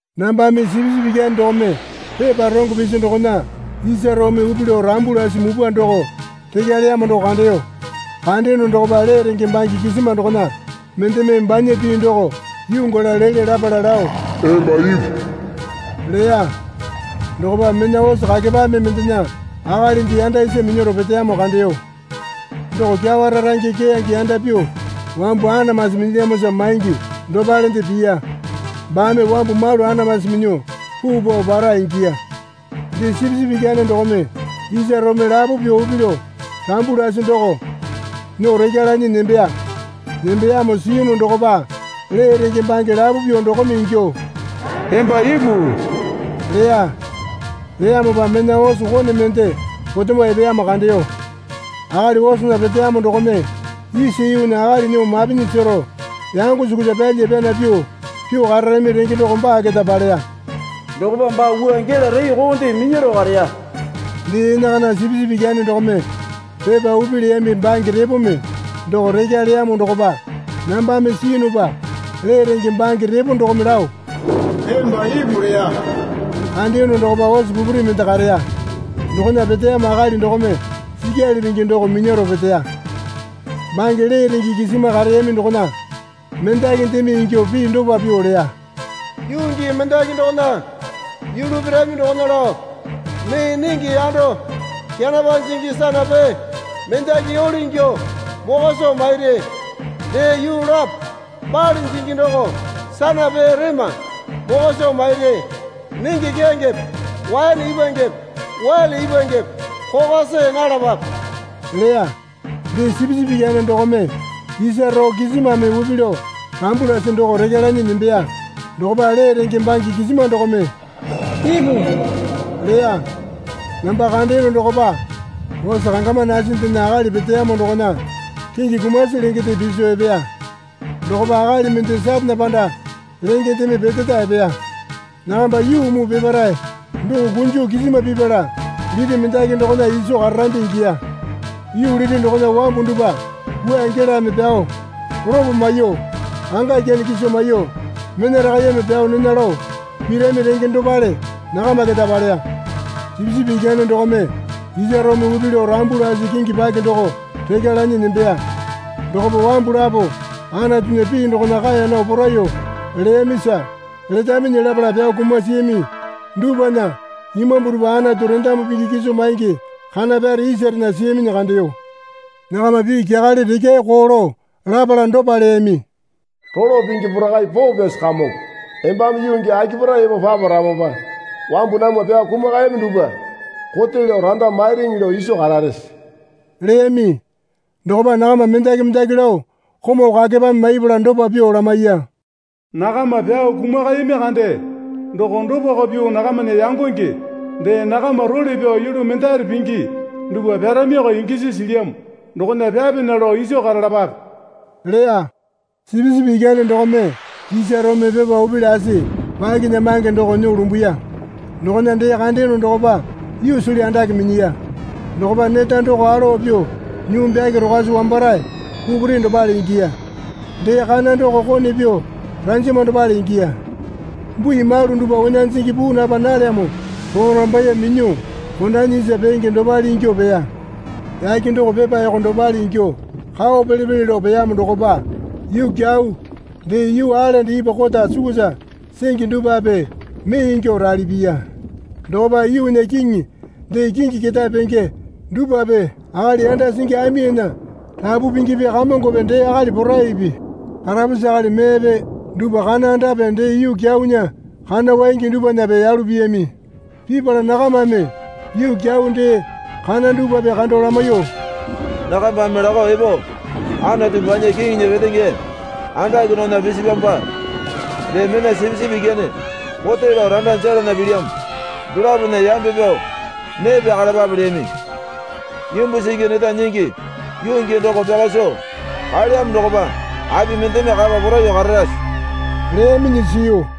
Nambame Sipisipi Ikyane dokome pepa rongo pisi dokona isa roome upi lao rambu lasi mupwa doko rekya leyamo doko kandeyo. Kandeyono dokopa lee renge bange kisima dokona mendeme banya pii doko yuu gala lele lapala lao, Emba ipu leya. Dokopa mena ose kakepame mendena akalinde yanda isa minyaro peteyamo kandeyo. Doko kyawa rarange keyange yanda pyuo wambu anamasi minyilyamosa maingi dopalende piya. Baame wambu malu anamasi minyuo puu pao para ingiya. Dee Sipisipi Ikyane dokome isa roome lapo pyuo upi lao rambu lasi doko nyuo rekya lanyi nembeya. Nembeyamo siyunu dokopa lee renge bange lapo pyuo dokome ingyuo, Emba ipu leya. Leyamopa mena ose kone mende potemo epeyamo kandeyo. Akali osena peteyamo dokome isa yuunya akali nyuo mapinyi sero yango sukusa pyalya pyana pyuo pyuo kararami renge doko baa keta paleya. Dokopa baa wua gela reekonde minyaro kareya. Dee enakana Sipisipi Ikyane dokome pepa upi leyami bange repome doko rekya leyamo dokopa nambame siyunupa lee renge bange repo dokome lao, Emba ipu leya. Kandeyono dokopa ose pupuri mende kareya. Dokona peteyamo akali dokome sikyali pingi doko minyaro peteya. Bange lee renge kisima kareyami dokona mendakindeme ingyuo pii dopa pyuo leya. Yuu gii mendaki dokona yulu pirami dokona lao mee nenge yando kenapa jingi sanapee mendaki yole ingyuo mokwa soo mairi. Dee yuu lapo bale jingi doko sanapee rema mokwa soo mairi. Nenge keyangepe waene ipwangepe wele ipwangepe kokwa see nalapape leya. Dee Sipisipi Ikyane dokome isa roo kisimame upi lao rambu lasi doko rekya lanyi nembeya. Dokopa lee renge bange kisima dokome, Ipu leya. Namba kandeyono dokopa ose kangama nasindena akali peteyamo dokona kingi kumasi lengende piso epeya. Dokopa akali mende Satane panda lengendeme peteta epeya. Nakamba yuu muu peparae doko kunjo kisima pipala liti mendaki dokona iso kararambi ingiya. Yuu liti dokona wambu dupwa wua gelame pyao, lopo maiyuo, anga ikyane kiso maiyuo, mena rakaiyeme pyao nena lao pirami renge dopale nakama keta paleya. Sipisipi Ikyane dokome isa roome upi lao rambu lasi kingi paki doko rekya lanyi nembeya. Dokopa wambu lapo Anatunya pii dokona kaeya nao poraiyuo leyamisa letaminyi lapala pyao kumasiyami dupwana imambu dupwa Anatu rendamu pingi kiso maingi kana pyare isarena siyaminyi kandeyo. Nakama pii kyakale rekyae koo lao lapala dopa leyami. Rolo Pingi Porakai Poo Pyasi Kamongo, embame yuu gii akipare epo paparamopa wambu namwa pyao kumakayami dupwa kote lao randa mairiŋi lao iso kararese? leyami. Dokopa nakama mendaki mendaki lao komau kakepame maipala dopa pyuo lamaiya. Nakama pyao kumakayami kande doko dopako pyuo nakamana yangonge dee nakama role pyao yulu mendare pingi dupwa pyaramiko ingisi silyamo dokona pyapena lao iso karalapape leya. Sipisipi Ikyane dokome isa roome pepa upi lasi pakinyamange doko nyuo lumbuya. Dokona dee kandeyono dokopa yuusili andake minyiya. Dokopa neta doko alowa pyuo nyuu byake rokwasi wambarae pupuri dopale ingiya. Dee kana doko kone pyuo ranjama dopale ingiya. Bui malu dupwa onya jingi puu napa nalyamo porambaiye minyuo kondanyi isa peenge dopale ingyuo peya. Yake doko pepa yoko dopale ingyuo kao pele pele lao peyamo dokopa yuu kyau, dee yuu aelende ipwa kota sukusa singi dupwape mee ingyuo rali piya. Dokopa yuunya kiŋi dee kingi ketae penge dupwape akali yanda singi aminya rapu pingipi kamongope dee akali poraipi karapusi akali meepe dupwa kana andape dee yuu kyaunya kana waingi dupwanape yalu piyami. Pipala nakamame yuu kyau dee kana dupwape kando lamaiyuo, Nakambame lakao epo Anatu banya Kiŋinya petenge andake dokona pisipyamopa dee mena Sipisipi Ikyane kote lao randa jelana pilyamo dolapona yambe pyao nee pyakalapape leyami. Imbu singi neta nyingi yuu gii doko pyaka soo kaelyamo dokopa api mendeme kapa poraiyuo kararase? leyaminyi siyu.